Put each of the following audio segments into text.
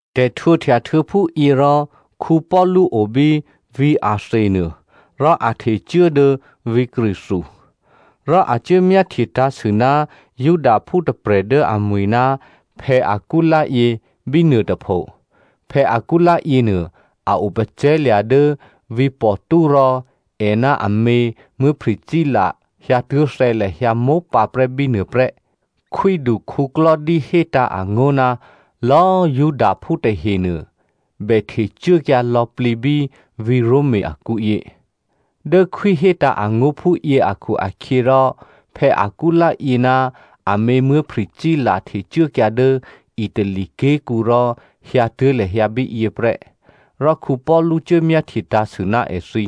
Tè̤htwǒhtya htuô̌ phúyě rò, Paulu o bí vǐ̤ Athenia nuô rò a htecuố dố vǐ̤ Corinthia. Rò a cuố myáhtye tǎ̤sû ná Judaphú tôprè̤ dố amwi̤ ná Aquila yě bínuô tôpho. Aquila yěnuô, a o pacè̤̌lya̤ dố vǐ̤ Pontus rò è ná amě Priscilla hyǎtuố̤thè̌ lahyǎ mópǎprè́ bínuô prè́. Khwídu Claudio hétǎ̤ angó̤ ná lò̌꤮ Judaphú tahenuô, bè htecuốkyǎ lò̌plǐ bí vǐ̤ Roma akǔyě. Dố khwí hétǎ̤ angó̤ phúyě akhu-akhyěrò Aquila yě ná amě Priscilla htecuốkyǎ dố Itali ké̤kǔ rò hyǎtuố̤ lahyǎ bíyě prè́. Rò Paulu cuố myáhtye tǎ̤sû ná èthǐ.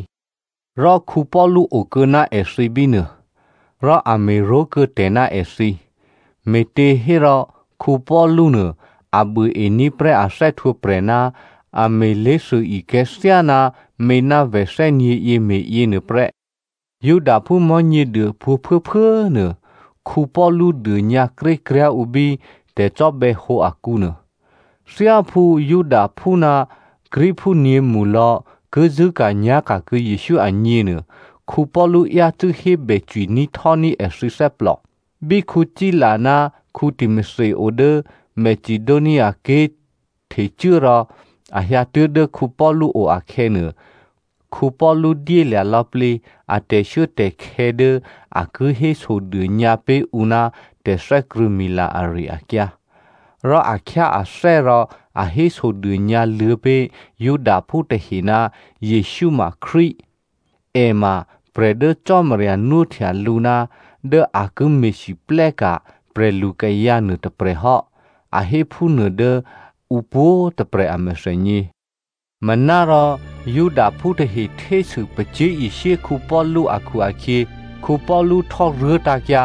Rò Paulu okuô̌ ná èthǐ bínuô. Rò a me̤ró̤kuô̌ tè̤ ná èthǐ, me̤těhérò Paulu nuô a buôení̤ prè́ a thè́htwǒprè̤ ná a me̤ lé̤thûikè̤̌ thyáná mě ná vè̤ thè́nyě̤yě me̤yěnuô prè́. Judaphú Mò̤́nyěduô pwǒ̤꤮ phuốphuố꤮ nuô, Paulu dônyǎkrékryá̤ ǔ bí tè̤cò́bè̌hǒ akǔnuô. Thyáphú Judaphú ná Greekphú nyě̤mṳlò̌ ki zṳ̂́ka̤nyá̤ka̤ kuô̌ Jesǔ agněnuô, Paulu yácû́ hébè cwiní̤htò́ní̤ èthǐ thè́plò. Bí Sila ná Timothy o dố Macedoniaké̤ htecuố rò a hyǎtuố̤ dố Paulu o akhè̌nuô, Paulu dyélya̤ lò̌plǐ a tè̤shuốtè̤khè̌ dố a ki hésodônyǎ pé̤ ǔ ná tè̤thè́krṳ̂̌mila ari-akyǎ. Rò a khyáathè́ rò a hésodônyǎ luô̌ pé̤ Judaphú tahe ná Jesǔ ma Krístu, è ma prè̤ dố Cò́marya nwóhtya lǔ ná dố a ki me̤lwóhteka̤ prè̤lukayǎ nuôtôprè̤ hò́, a hé phúnuô dố ǔ pwǒ̤꤮ tôprè̤ a mèthènyě. Manárò Judaphú tahe htésû pacyé̤ishyé Paulu akhu-akhyě, Paulu htò́ruố tǎ̤kyǎ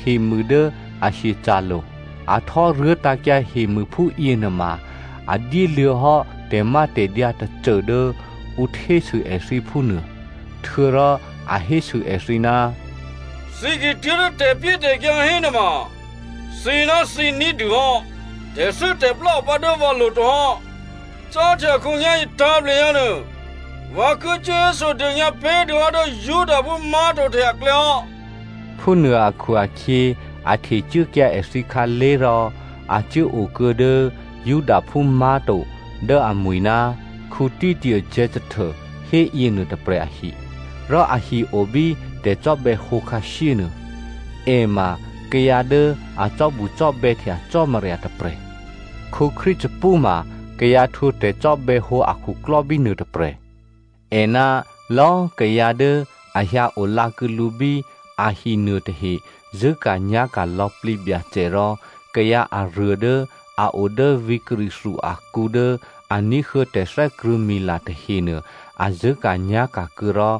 hemû dố a hyeca̤lo̤. A htò́ruố tǎ̤kyǎ hemû phúyěnuôma a dyéluô̌hò́ tè̤mátè̤dyǎ tôcô dố ǔ htésû èthǐ phúnuô. Htuô̌rò a hésû èthǐ, “Thǐ ki tuố̤dố tè̤pyétè̤kyǎ hénuôma thǐnáthǐ ní̤dûhò́. Tè̤thû́tè̤plá opǎ dố vǎlo̤ to hò́. Cáhtya khǒnyá̤yě tǎ̤plehyǎ nuô, vǎ ki cuố hésodônyǎ pé̤dûhò́ dố Judaphú má̤to tahe aklè̌hò́.” Phúnuô akhu-akhyě, a htecuốkyǎ èthǐ khǎlé̤ rò a cuố okuô̌ dố Judaphú má̤to dố amwi̤ ná Titio Justo hé yěnuô tôprè̤ ahi, rò ahi o bí tè̤cò́bè̌hǒ khǎshyénuô. È ma kayǎ dố a cò́bucò́bè̌htya Cò́marya tôprè̤. Crispu ma kayǎ htwǒ tè̤cò́bè̌hǒ akhuklò́ bínuô tôprè̤. È ná lò̌꤮ kayǎ dố a hyǎolǎ kuô̌ lǔ bí ahi nuôtahe zṳ̂́ka̤nyá̤ka̤ lò̌plǐ Byacè rò kayǎ aruô dố a o dố vǐ̤ Corinthia akǔ dố a ní̤huô̌ tè̤thè́krṳ̂̌mila tahenuô, a zṳ̂́ka̤nyá̤ka̤ kuô̌ rò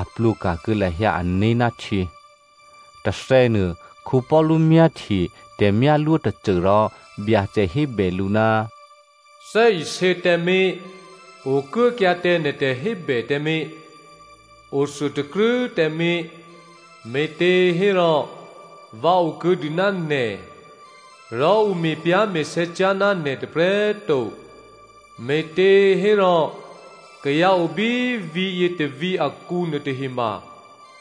a plwǒka̤ kuô̌ lahyǎ ané̤ ná htyě. Tôthè̌nuô, Paulu myáhtye tè̤myálwó tôcô rò Byacè hébè lǔ, “Thè́isě tǎmé̤! Okuốkyǎ tǎ nè̤ tè̤hébè tǎmé̤! Othuôtakrû́ tǎmé̤! Me̤těhérò vǎ okuô̌dû ná nè̤, rò ǔ me̤pyá̤me̤sè̌ cyá̤ ná nè̤ tôprè̤꤮ to, me̤těhérò kayǎ obí vǐ̤yě tôvǐ̤ akǔ nuôtahema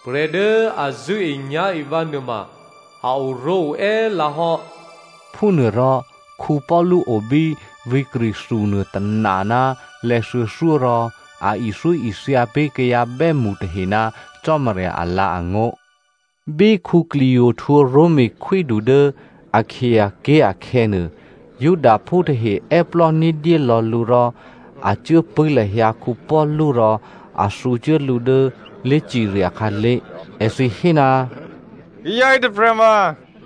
prè̤ dố a zṳ̂́enyá̤e vǎ nuôma a oró̤oè́ lǎhò́.” Phúnuôrò Paulu obí vǐ̤ Corinthia nuô tôna ná lè̌thuô̌thyó rò a ithyóithya pé̤ kayǎ bè́mṳ tahe ná Cò́marya alǎ̤angó̤. Bí Gallio htwǒ Roma khwídu dố Akaia ké̤ akhè̌nuô, Judaphú tahe è́plò́ ní̤dyé lò̌ lǔ rò a cuốpṳ̂́ lahyǎ Paulu rò a thǔcuố lǔ dố lé̤cirya khǎlé̤. Èthǐ hé, “Kayǎ yětôprè̤ma,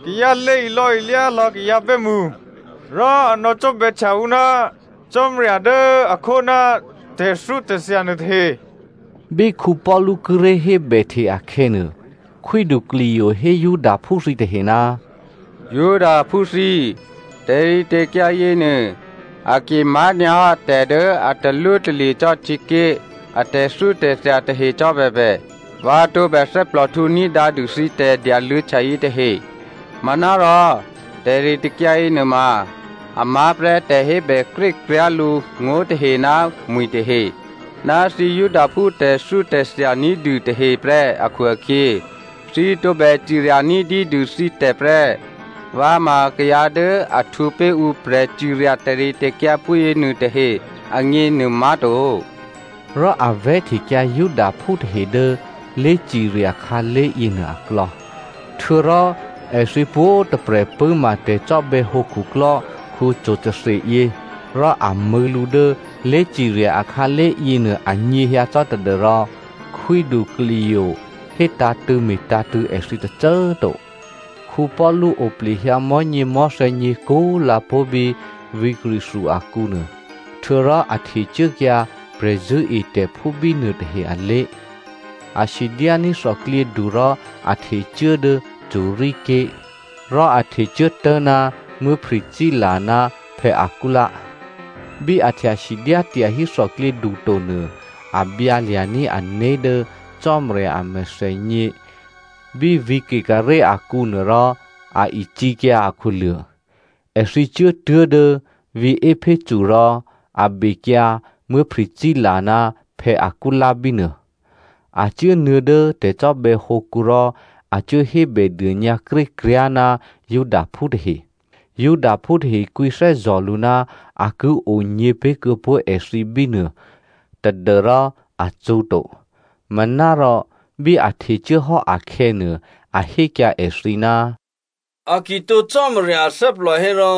kayǎ lě ilò̌ilyá lò̌ kayǎ bè́mṳ. Rò a nò̌cò́bè̌htya ǔ ná Cò́marya dố a khó ná tè̤thyótè̤thya nuôtahe.” Bí Paulu kíré̤ hébèhte akhè̌nuô, Khwídu Gallio hé Judaphú thǐtahe, “Judaphú thǐ꤮, tè̤ritè̤kyǎ yěnuô a ki má̤nyǎhò́ tè̤ dố a talwótalye̤ cò́ htyěké̤ a tè̤thyótè̤thya tahe cò́bèbè, vǎ tǒbè thè́plòhtǔ ní̤dǎ dû thǐ tè̤dyaluô̌htya yětahe. Manárò tè̤ritè̤kyǎ yěnuôma a má̤prè́ tè̤hébè krékryá̤ lǔ ngó̤ tahe ná mwi̤ tahe, ná thǐ Judaphú tè̤thyótè̤thya ní̤dû tahe prè́ akhu-akhyě, thǐ tǒbè cirya ní̤dyédû thǐtè̤ prè́. Vǎ ma kayǎ dố a htwǒ pé̤ ǔ prè̤cirya tè̤ritè̤kyǎ phúyěnuô tahe agněnuô má̤to.” Rò a vè̤́htekyǎ Judaphú tahe dố lé̤cirya khǎlé̤ yěnuô aklò̌. Htuô̌rò èthǐ pwǒ̤꤮ tôprè̤ pṳ̂́ma tè̤cò́bè̌hǒ khuklò́ Sostheno yě, rò a mṳ̂̌ lǔ dố lé̤cirya akhǎlé̤ yěnuô anyěhyǎ cò́ tadû́rò Khwídu Gallio hétǎ̤tṳ̂̌ me̤tǎ̤tṳ̂̌ èthǐ tôcô꤮ to. Paulu oplehyǎ mò̤́nyěmò̤́thè̌ nyě̤kú꤮ lǎ pó̤ bí vǐ̤ Corinthia akǔnuô, htuô̌rò a htecuốkyǎ prè̤zṳ̂́etè̤phú bínuô tahe alé̤. A sidyání̤ thòklyědu rò a htecuố dố Syria ké̤. Rò a htecuố tố̤ná Priscilla ná Aquila. Bí a htya sidyá tyahí thòklyědu to nuô, a byǎ lya̤ní̤ ané̤ dố Cò́marya a mèthènyě bí vǐ̤ Cenchrea akǔnuô rò a icǐkyǎ akhuluô̤. Èthǐ cuốtuố̤ dố vǐ̤ Epheso rò a bekyǎ Priscilla ná Aquila bínuô. A cuốnuô̌ dố tè̤cò́bè̌hǒkǔ rò a cuố hébèdônyǎ krékryá̤ ná Judaphú tahe. Judaphú tahe kwǐthè́zò̤ lǔ ná a ki onyě̤ pé̤kuô̌pó̤ èthǐ bínuô tadû́rò a cṳ̌to. Manárò bí a htecuố hò́ akhè̌nuô, a hékyǎ èthǐ, “A ki tǒ Cò́marya athè́plò hérò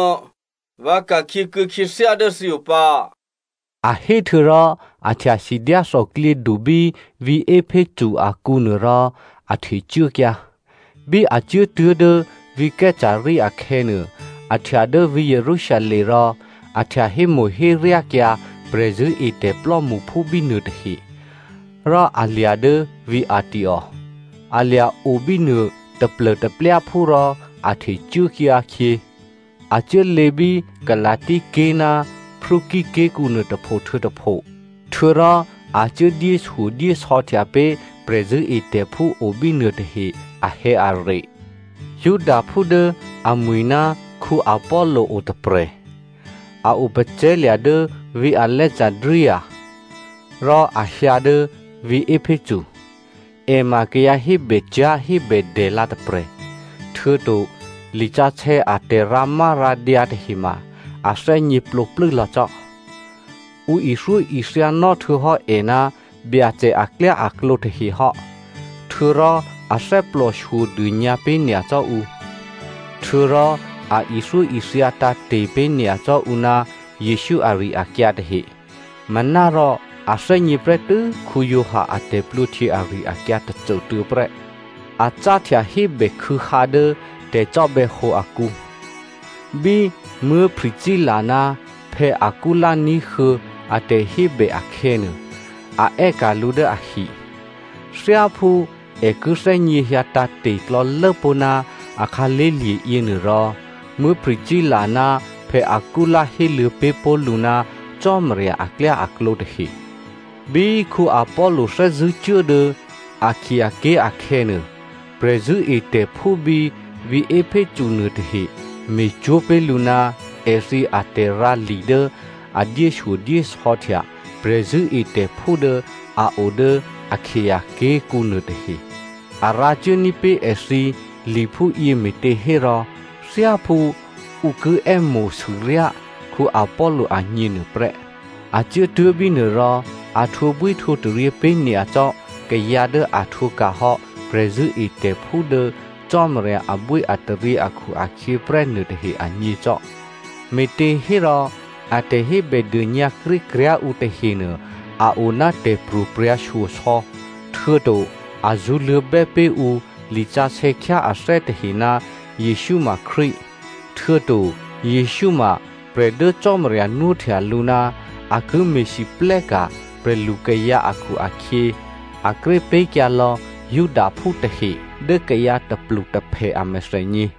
vǎ ka̤khyě kuô̌ khyěthyá dố thǐo pǎ.” A hé htuô̌rò a htya sidyá thòklyědu bí vǐ̤ Epheso akǔnuô rò a htecuốkyǎ. Bí a cuốtuố̤ dố vǐ̤ Caesarea akhè̌nuô, a htya dố vǐ̤ Jerusalem rò a htya hémo̤héryákyǎ prè̤zṳ̂́etè̤ plò́mṳphú bínuô tahe, rò a lya̤ dố vǐ̤ Antioko. A lya̤ o bínuô taplô̤taplyáphú rò a htecuốkyǎ khyě. A cuốlě bí Galasia ké̤ ná Phrygia ké̤kǔnuô tôpho htuô̌ tôpho. Htuô̌rò a cuố dyéshyodyésò̌htya pé̤ prè̤zṳ̂́etè̤phú o bínuô tahe ahè̌are. Judaphú dố amwi̤ ná Apollo otôprè̤. A opacè̤̌lya̤ dố vǐ̤ Alexandria, rò a hyǎ dố vǐ̤ Epheso. È ma kayǎ hébècyá̤hébèdè lǎ tôprè̤. Htuô̌to lisǎsè̌ a tè̤rǎmárǎdyǎ tahe꤮ ma a thè́gněplǒplû́ lò̌ cò́. Ǔ ithyóithyanò́ htuô̌hò́ è ná Byacè aklyáaklǒ tahe hò́. Htuô̌rò a thè́plòshyo dônyǎpé̤ nyacò́ ǔ, htuô̌rò a ithyóithya tǎ̤te̤ pé̤ nyacò́ ǔ ná Jesǔ ari-akyǎ tahe. Manárò a thè́gně prè́tû́ Giovanni a tè̤plwǒhtyě ari-akyǎ tôcôtuô̌ prè́. A cáhtya hébèkhû̌hǎ dố tè̤cò́bè̌hǒ akǔ. Bí Priscilla ná Aquila ní̤huô̌ a tè̤hébè akhè̌nuô, a è́ka̤ lǔ dố ahi. Thyáphú è ki thè́gněhyǎ tǎ̤te̤ klò̌lốpó̤ ná a khǎlé̤lye̤ yěnuôrò, Priscilla ná Aquila héluô̌ pé̤ pó̤ lǔ ná Cò́marya aklyáaklǒ tahe. Bí Apollo thè́zṳ̂́ cuố dố Akaia ké̤ akhè̌nuô, prè̤zṳ̂́etè̤phú bí vǐ̤ Epheso nuôtahe me̤cwó̤ pé̤ lǔ ná èthǐ atè̤rǎli dố a dyéshyodyésò̌htya prè̤zṳ̂́etè̤phú dố a o dố Akaia ké̤kǔ nuôtahe. A rǎcuốní̤ pé̤ èthǐ li phúyě me̤těhérò thyáphú ǔ ki è́mo̤sûryá Apollo agněnuô prè́. A cuốtuố̤ bínuô rò a htwǒbwíhtwǒtaryě pé̤nyacò́ kayǎ dố a htwǒka̤hò́ prè̤zṳ̂́etè̤phú dố Cò́marya abwíataryě akhu-akhyě prè́ nuôtahe agně cò́. Me̤těhérò, a tè̤hébèdônyǎ krékryá̤ ǔ tahenuô a oná tè̤pro̤prya̤shyosò̌, htuô̌to a zṳ̌luô̌bè́ pé̤ ǔ lisǎsè̌ khyáathè́ tahe ná Jesǔ ma Krístu, htuô̌to Jesǔ ma prè̤ dố Cò́marya nwóhtya lǔ ná a ki me̤lwóhteka̤ prè̤lukayǎ akhu-akhyě, a kré pé̤kyǎ lò̌ Judaphú tahe dố kayǎ tôplutôphè a mèthènyě.